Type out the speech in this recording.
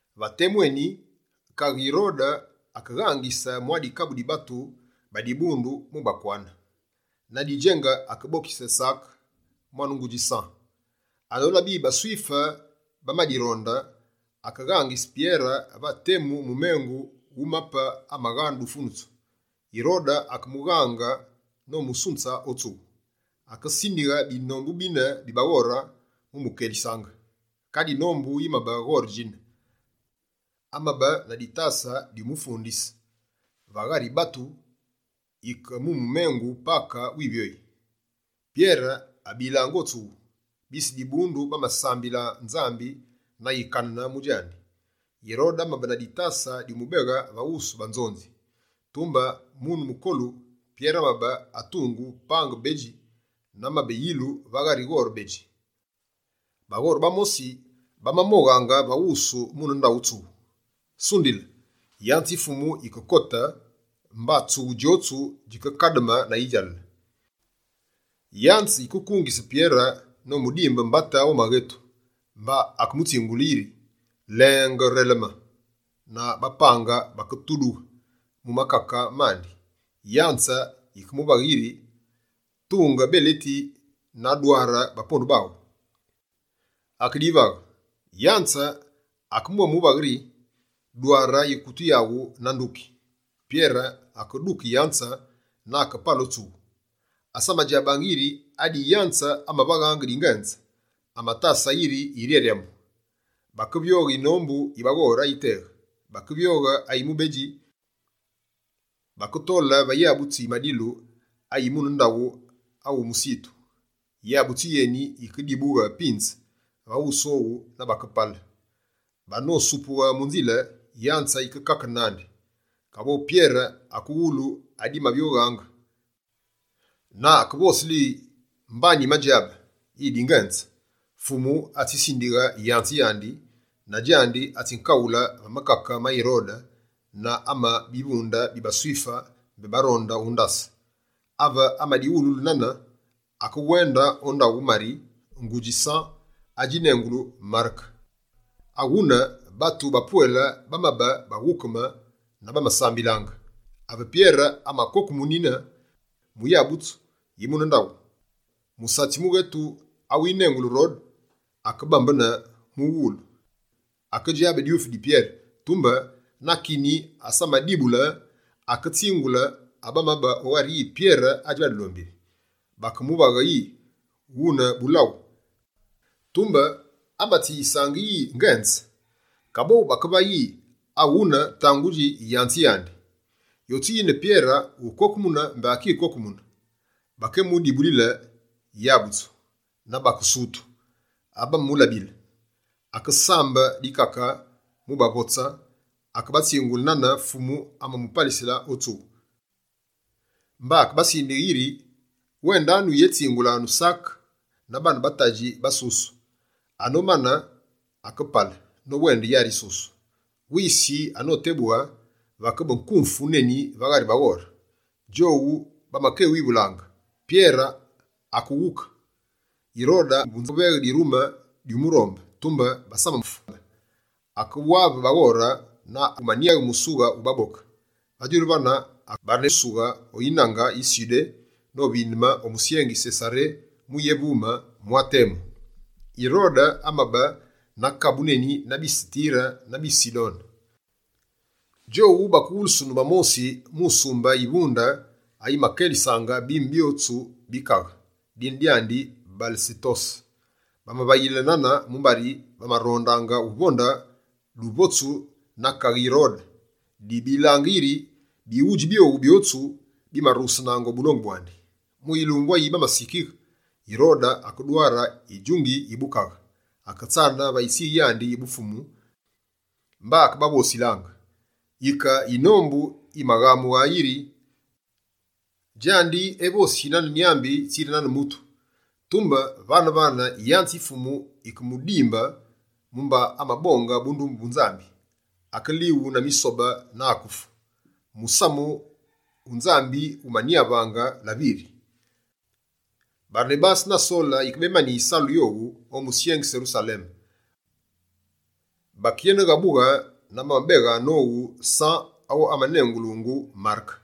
Va temu eni, kaghe Yirode akeghangise mwa dikabu di batu ba dibundu mu bakwane. Na didjenge akebokise Sake, mwane ngudji San. Anolabe yi baSwife bamadironde, akeghangise Pyere va temu mumengu wu bapembi abagha dufunusu. Yirode akemughaange nomusunze o tsughu. Akesindighe binombu bine bi baghore mu mukelisaange. Kadi yinombu yimabe ghore djine. Amabe na ditase dyumufundise, va ghari batu yike mumengu Pake wivyoyi. Pyere abilange o tsughu, bise dibundu bamasambile Nzambi na yikanene mu djandi. Yirode amabe na ditase dyumubeghe va wusu banzonzi. Tumbe mune mukolu, Pyere amabe atungu pange bedji, na amabe yilu va ghari ghore bedji. Baghore bamosi, bamamoghaange va wusu mune ndaghu tsughu. Sundile, yanze yi Fumu yikekote mba tsughu djotsu djikekademe na yidjalale. Yanze yikekungise Pyere nomudimbe mbate o maghetu, mba akemutsingule yi: «Lenge noreleme!» Na bapange baketudughe mu makake mandi. Yanze yike muvaghe yiri: «Tunge beleti aghu na dware bapondu baghu.» Akedivaghe. Yanze yikemwémuvaghe yi: «Dware yikutu yaghu na nduki.» Pyere akeduke yanze na akepale o tsughu. Asamadjabaange yiri adi yanze amavaghaange dingenze, amatasaange yiri yiryaryamu. Bakevyoghe yinombu yi baghore ayiteghe, bakevyoghe ayi mubedji, baketole va yabutsu yi madilu ayi mune ndaghu awumusitu. Yabutsu yeni yikedibughe pinze va wusu owu na bakepale. Banosupughe mu nzile, yanze yikekakene nandi. Kaboghu Pyere akewulu adimavyoghaange, na akekévosile yi: «Mba nyimadjabe yi dingenze: Fumu atsitinde yanze yandi, na djandi, atsinkaghule va makake ma Yirode, na ame bivunde bi baSwife mbé baronde undase.» Ave amadiwululu nane, akewende o ndaghu Mari, ngudji San adjinengulu Mareke. Aghune, batu bapwele bamabe baghukeme na bamasambililaange. Ave Pyere amakokemunine mu yabutsu yi mune ndaghu, musatsi mughetu, awinengulu Rode, akebambene mughulu. Akedjabe dyufi di Pyere, tumbe na kini asamadibule, aketsingule abamabe o ghari yi Pyere adji va dulombili. Bakemuvaghe yi: «Wune bulaghu!» Tumbe amatsiyisaange yi ngenze. Kaboghu bakevaghe yi: «Awune tangudji yanze yandi.» Yotsu yina, Pyere ukokemune mbé akikokemune. Bakemudibulile yabutsu, na bakesutu ave bamamulabile. Akesambe dikake mubavotse, akebatsingule nane Fumu amamupalisile o tsughu, mba akebasindighe yiri: «Wendanu yétsingulanu Sake na baane ba tadji basusu.» Anomane, akepale nowende yari yisusu. Wisi anotebughe, vakebe nkumfu neni va ghari baghore. Djowu bamakewivulaange: «Pyere akewuke?» Yirode akeveghe dirume dyumurombe, tumbe basamamulabe. Akewave baghore, na akeveghe musughe wu baboke. Va djulu vane, akeghusughe o yinange yi Sudé novindeme o musyengi Sesaré mu yévume mwa temu. Yirode amabe na kabu neni na bise Tire na bise Sidone. Djowu bakewulusunu va mosi mu sumbe yivunde, ayimakelisaange bime byotsu bi kaghe, dine dyandi Balesetose. Bamavayile nane, mumbari bamarondaange uvonde duvotsu na kaghe Yirode, dibilaange yiri bighudji byowu byotsu, bimarughesenaange o bulongu bwandi. Mu yilumbu ayi bamasikighe, Yirode akedware yidjunge yi bukaghe, aketsane va yitsighe yandi yi bufumu, mba akebavosilaange. Yike yinombu yimaghamughe yiri: «Djandi evosi nane nyambi, tsiri nane mutu!» Tumbe vane-vane, yanze yi Fumu yikemudimbe, mumba amabonge bundumbe bu Nzambi: akelighu na misobe, na akefu. Musamu wu Nzambi wumanyavaange laviri. Barenabase na Sole yikebemani yisalu yowu o musyengi Serusaleme, bakeyeneghabughe, na bamabeghe nowu San awu amanengulungu Mareke.